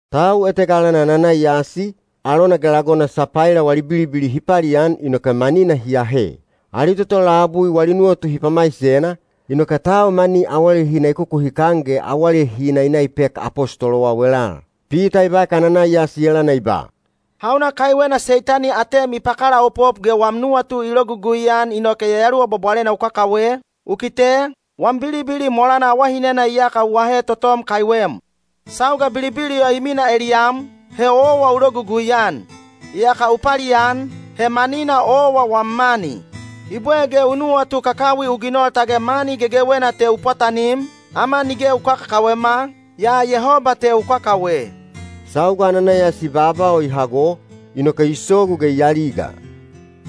Tau etega alana Ananaiyasi, alona ge lagona Sapaila wali bilibili hi palian inoke manina hi ahe. Ali toto labui wali nuwatu hi pamaisena, inoke tau mani awalehina i kukuhikan ge awalehina i na i pek apostolowau elal. Pita i baek Ananaiyasi elana i ba, “Hauna kaiwena Seitani atem i pakalaopop ge wam nuwatu i logugui-an inoke Yayaluwa Bwabwalena u kakawe? U kite, wam bilibili molana awalehina iyaka u ahe totom kaiwem. Sauga bilibili o i minaa eliyam, he owa u logugui-an. Iyaka u palian, he manina owa wam mani. I bwe ge u nuwatu kakawi nu ginol tage mani gegewena te u pwatanim? Ama nige u kakakawema, yaa Yehoba te u kakawe.” Sauga Ananaiyasi baaba o i hago, inoke i sogu ge i aliga.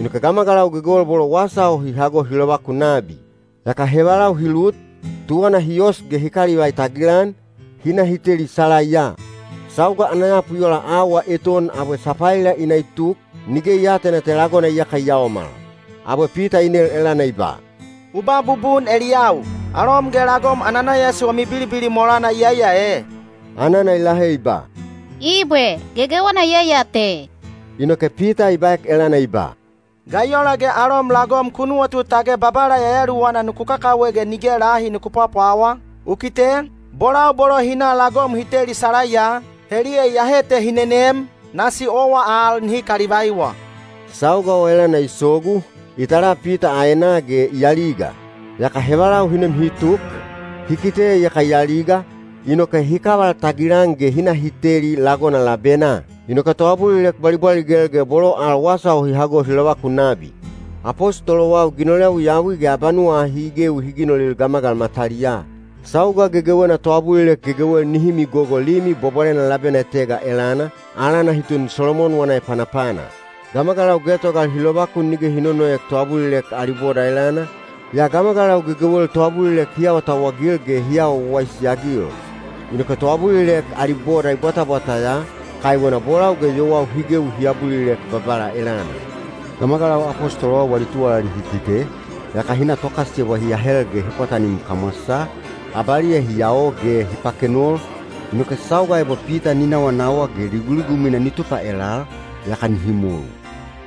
Inoke gamagalau gegewel bolo wasa o hi hago hi lovakun nabi. Yaka hevalau hi lut, tuwana hi os ge hi kalivai tagilan, hi na hi teli salaiya. Sauga ana yapu i ola auwa eton abwe Sapaila i na i tuk, nige i aatena te lagona iyaka i yaomal. Abwe Pita i nel elana i ba, “U ba bubun eliyau, alom ge lagom Ananaiyasi wami bilibili molana iyai ya e?” Anana i lahe i ba, “Ibwe, gegewena iyai ya te.” Inoke Pita i baek elana i ba, “Ga i ola ge alom lagom ku nuwatu tage Babala Yayaluwana nuku kakawe ge nige lahi nuku pwapwawa? U kite, bolau bolo hi na lagom hi teli salaiya, heliya iyahe te hi nenem, nasi owa al nihi kalivaiwa.” Sauga o elana i sogu, i tala Pita aenaa ge i aliga. Yaka hevalau hi nem hi tuk, hi kite iyaka i aliga, inoke hi kaval tagilan ge hi na hi teli lagona labenaa. Inoke toabulilek bwalibwaligel ge bolo al wasa o hi hago hi lovakun nabi. Apostolowau ginol yawiyawi ge abanuwa ahi i gewi hi ginolil gamagalau mataliyaa. Sauga gegewena toabulilek gegewel nihi migogo Limi Bwabwalena labena etega elana, alana hi tun “Solomon wana Epanapana.” Gamagalau getogal hi lovakun nige hi nonoek toabulilek ali boda elana, yaa gamagalau gegewel toabulilek hi awatauwagil ge hi awa wawaisi-agil. Inoke toabulilek ali boda i bwatabwata ya, kaiwena bolau ge yowau hi gewi hi abulilek Babala elana. Gamagalau apostolowau wali tuwalali hi kite, yaka hi na tokasiyebwa hi ahel ge hi pwatanim kamwasaa, abaliya hi yao ge hi pakenol, inoke sauga ebo Pita ni nawanawa ge liguligumwina ni tupa elal, yaka nihi molu.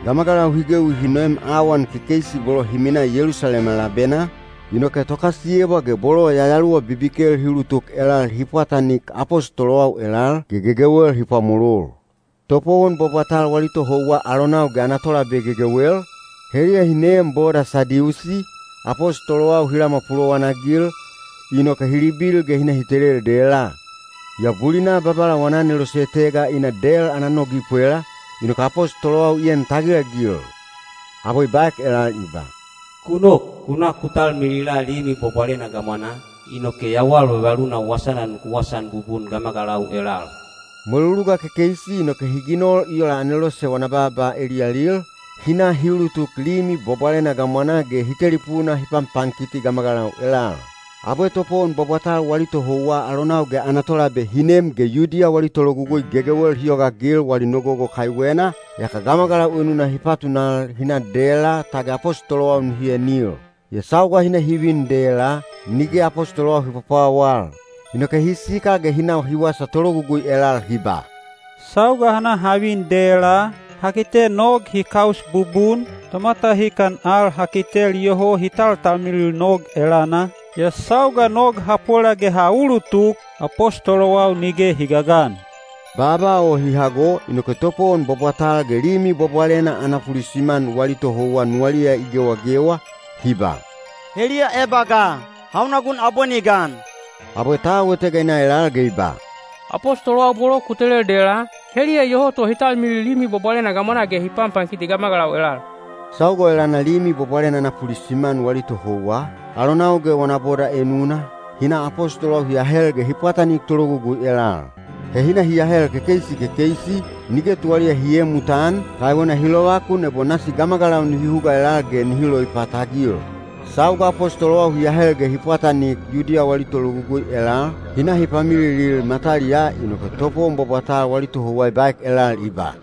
Gamagalau hi gewi hi noem awan kekeisi bolo hi minaa Yelusalema labenaa, inoke tokasiyebwa ge bolo yayaluwa bibikel hi ulutuk elal hi pwatanik apostolowau elal ge gegewel hi pwamolol. Topowon bwabwatal wali tohouwa alonau ge ana tolabe gegewel, heliya hi neem boda Sadiusi, apostolowau hi lamwa pulowanagil, inoke hi libil ge hi na hi telel dela. Yaa bulina Babala wana anelose etega i na del ana nog i pwela, inoke apostolowau i en tagilagil. Abwe i baek elal i ba, “Ku nok, ku na ku talmilila Limi Bwabwalena gamwanaa, inoke yawal vavaluna wasana nuku wasaan bubun gamagalau elal.” Mweluluga kekeisi inoke hi ginol i ola anelose wana baaba eliyalil, hi na hi ulutuk Limi Bwabwalena gamwanaa ge hi telipuna hi panpankiti gamagalau elal. Abwe topowon bwabwatal wali tohouwa alonau ge ana tolabe hi nem ge Yudiya wali tologugui gegewel hi yogaagil wali nogogo kaiwena, yaka gamagalau enuna hi patunal hi na dela tage apostolowau nihi enil. Yaa sauga hi na hi vin dela, nige apostolowau hi pwapwawal. Inoke hi sikal ge hi na hi wasa tologugui elal hi ba, “Sauga ha na ha vin dela, ha kite nog hi kaus bubun, tomatahikan al ha kitel iyoho hi taltalmilil nog elana, yaa sauga nog ha pwela ge ha ulutuk, apostolowau nige hi gagan.” Baaba o hi hago inoke topowon bwabwatal ge Limi Bwabwalena ana pulisiman wali tohouwa nuwaliya i gewagewa, hi ba, “Heliya eba ga? Hauna gun abwe ni gan?” Abwe tau etega i na elal ge i ba, “Apostolowau bolo ku telel dela, heliya iyoho to hi talmilil Limi Bwabwalena gamwanaa ge hi panpankiti gamagalau elal.” Sauga o elana Limi Bwabwalena ana pulisiman wali tohouwa, alonau ge wana boda enuna, hi na apostolowau hi ahel ge hi pwatanik tologugui elal. He hi na hi ahel kekeisi kekeisi, nige tuwaliya hi eemutan, kaiwena hi lovakun ebo nasi gamagalau nihi huga elal ge nihi loipatagil. Sauga apostolowau hi ahel ge hi pwatanik Yudiya wali tologugui elal, hi na hi pamililil mataliyaa inoke topowon bwabwatal wali tohouwa i baek elal i ba,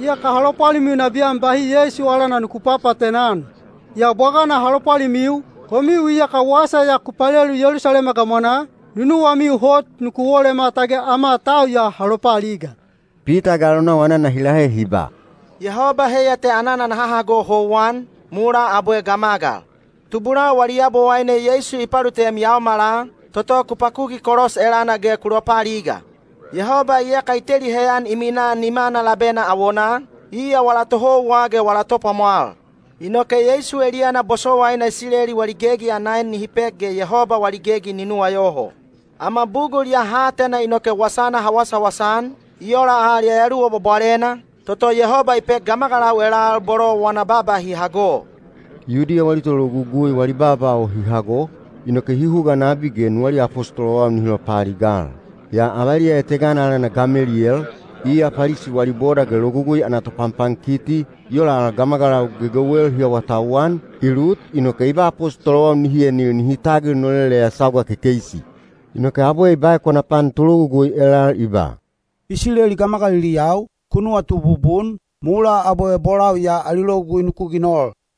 “Iyaka ha lopwalimiu nabiyan bahi Yeisu alana nuku papaatena-an. Yaa bwagana ha lopwalimiu, komiu iyaka wasa ya ku palelu Yelusalema gamwanaa, nunuwamiu hot nuku wolema tage ama tau ya ha lopaaliga.” Pita ge alonau anana hi lahe hi ba, “Yehoba heiya te anana naha hago houwan, mulaa abwe gamagal. Tubulau wali Yabowaine Yeisu i palutem yaomala, toto ku pakuki kolos elana ge ku lopaaliga. Yehoba iyaka i teli heyan i minaa nimana labena awonaa, iya wala Tohouwa ge wala Topwamwal. Inoke Yeisu eliyana bosowaina Isileli wali gegi ana en nihi pek ge Yehoba wali gegi ni nuwayoho. Ama bugul ya ha atena inoke wasana ha wasawasa-an, i ola al Yayaluwa Bwabwalena, toto Yehoba i pek gamagalau elal bolo wana baaba hi hago.” Yudiya wali tologugui wali baaba o hi hago, inoke hi huga nabi ge nuwaliya apostolowau nihi lopaaligal. Yaa avaliya etegana alana Gameliyel, iya Palisi wali boda ge Logugui ana topanpankiti, i ola al gamagalau gegewel hi awatauwan, i lut inoke i ba apostolowau nihi enil nihi tagil noleleya sauga kekeisi. Inoke abwe i baek wana pan tologugui elal i ba, “Isileli gamagaliliyau, ku nuwatu bubun, mulaa abwe bolau ya ali logugui nuku ginol.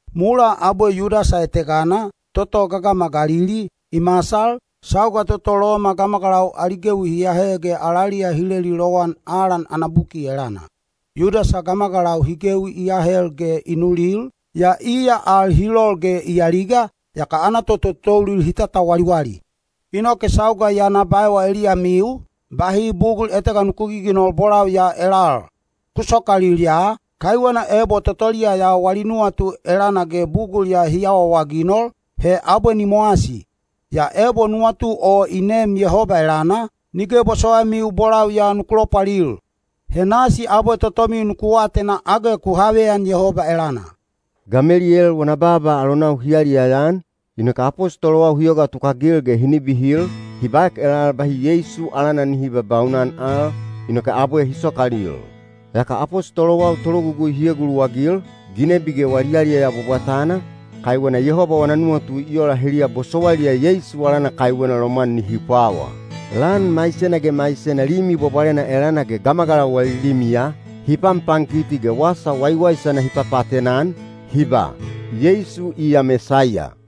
Mulaa abwe Yudasa etegana, toto gagama Galili, i masal, sauga toto Loma gamagalau ali gewi hi ahe ge alaliya hi leli lowan alan ana buki elana. Yudasa gamagalau hi gewi i ahel ge i nulil, yaa iya al hi lol ge i aliga, yaka ana tototoulil hi tatawaliwali. Inoke sauga ya na baewa eliyamiu, bahi bugul etega nuku giginol bolau ya elal. Ku sokalil ya, kaiwena ebo totoliya ya wali nuwatu elana ge bugul ya hi awaawaginol, he abwe ni mowasi. Yaa ebo nuwatu o i neem Yehoba elana, nige bosowaimiu bolau ya nuku lopwalil. He nasi abwe totomiu nuku atena age ku haveyan Yehoba elana.” Gameliyel wana baaba alonau hi yaliyaya-an, inoke apostolowau hi yoga tukagil ge hi nibihil, hi baek elal bahi Yeisu alana nihi babaunan al, inoke abwe hi sokalil. Yaka apostolowau tologugui hi eguluwagil, ginebi ge wali yaliyaya bwabwatana, kaiwena Yehoba wana nuwatu i ola heliya bosowailiya Yeisu alana kaiwena lomwan nihi pwawa. Lan maisena ge maisena Limi Bwabwalena elana ge gamagalau wali limiya, hi panpankiti ge wasa waiwaisana hi papaatena-an, hi ba, “Yeisu iya Mesaiya.”